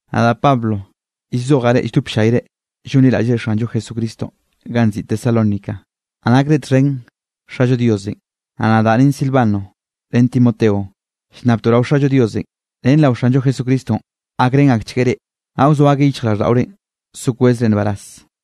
Nadaꞌ Pablo llzojaꞌ reꞌ lldop ll-llayre llonliraꞌllre Xanllo Jesucristonꞌ ganꞌ nziꞌi Tesalónica, naꞌ nakre txhen Xallo Diosenꞌ. Naꞌ nadaꞌ ren Silvano ren Timoteo llnnabtoꞌ rao Xallo Diosenꞌ ren rao Xanllo Jesucristonꞌ, gakrén akchgueꞌ reꞌ, naꞌ wzoa akeꞌ yichjraꞌlldaꞌorenꞌ so kwezre nbaraz.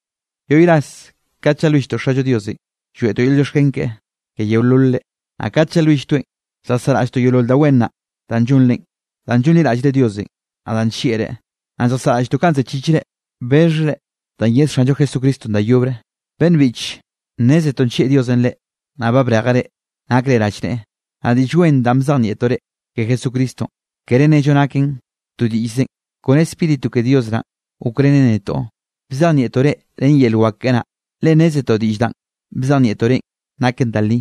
Yoꞌy ras kat llalwilltoꞌ Xallo Diosenꞌ, lloeꞌtoꞌ yel llioxken keꞌe ke yeololre. Naꞌ kat llalwilltoeꞌn, lljasaꞌraꞌlltoꞌ yeolol da wen naꞌ danꞌ llonre, danꞌ llonliraꞌllre Diosenꞌ, naꞌ danꞌ nllieꞌreꞌ. Naꞌ lljasaꞌraꞌlltoꞌ kanꞌ zechichre bexhre danꞌ yed Xanllo Jesucristonꞌ da yobre. Beꞌnn biꞌche, nnézetoꞌ nllieꞌ Diosenꞌ reꞌ, naꞌ ba brejeꞌ reꞌ, nakre rallneꞌe. Naꞌ Diꞌll Wen danꞌ bzejnieꞌtoꞌ reꞌ ke Jesucristonꞌ, kere nnello naken to diꞌllzenꞌ. Kone Spíritu ke Dios naꞌn gokrenen netoꞌ bzejnieꞌtoꞌ reꞌ ren yel wak keꞌe naꞌ, le nnézetoꞌ diꞌll danꞌ bzejnieꞌtoꞌ reꞌn naken da li.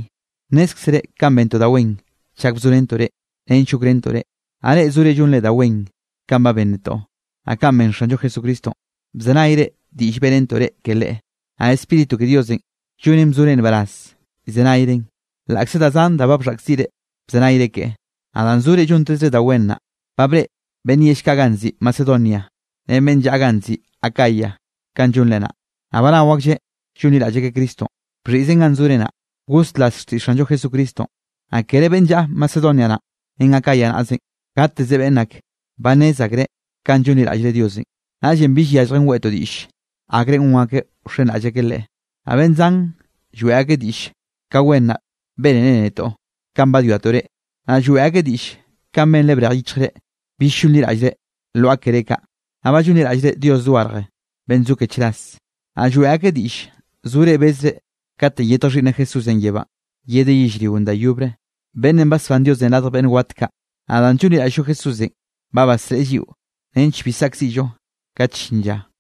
Nnézkzere kanꞌ bentoꞌ da wen chak bzorentoꞌ reꞌ nench gokrentoꞌ reꞌ. Naꞌ reꞌ zore llonre da wen kanꞌ ben netoꞌ, naꞌ kanꞌ ben Xanllo Jesucristonꞌ. Bzenayre diꞌll beꞌrentoꞌ reꞌ ke Leꞌe, naꞌ Spíritu ke Diosenꞌ llonen bzore nbaraz llzenayren, laꞌkze da zan da ba bxhaꞌkziꞌre bzenayre keꞌe. Naꞌ danꞌ zore llontezre da wen naꞌ, ba breꞌe beꞌnn yell kaꞌ ganꞌ nziꞌi Macedonia ren beꞌnn llaꞌa ganꞌ nziꞌi Acaya kanꞌ llonre naꞌ, naꞌ ba nao aklleꞌ llonliraꞌll akeꞌ Cristonꞌ. Bxhiꞌzen ganꞌ zore naꞌ, goslas xtiꞌll Xanllo Jesucristonꞌ, naꞌ kere beꞌnn llaꞌa Macedonia naꞌ ren Acaya naꞌzenꞌ, gateze beꞌnn ake, ba nnez akreꞌ kanꞌ llonliraꞌllre Diosenꞌ, naꞌllenꞌ bill yalljen weꞌtoꞌ diꞌll, akrenꞌ gon akeꞌ wxenraꞌll akeꞌ Leꞌe. Naꞌ beꞌnn zan lloeꞌ akeꞌ diꞌll ka wen naꞌ benrenre netoꞌ kanꞌ badwiatoꞌ reꞌ, naꞌ lloeꞌ akeꞌ diꞌll kanꞌ benre brej yichjre bill llonliraꞌllre lwaꞌa keré kaꞌ, naꞌ ba llonliraꞌllre Dios dogarje beꞌnn zo ke chras. Naꞌ lloeꞌ akeꞌ diꞌll zore bezre katenꞌ yetj Xhiꞌnneꞌ Jesúsenꞌ yebánꞌ, yedeꞌ yellrionꞌ da yobre, beꞌnnenꞌ basbán Diosenꞌ radj beꞌnn wat kaꞌ. Naꞌ danꞌ llonliraꞌll-llo Jesúsenꞌ, ba basreꞌe lliꞌo nench bi saꞌkziꞌllo kat llin lla.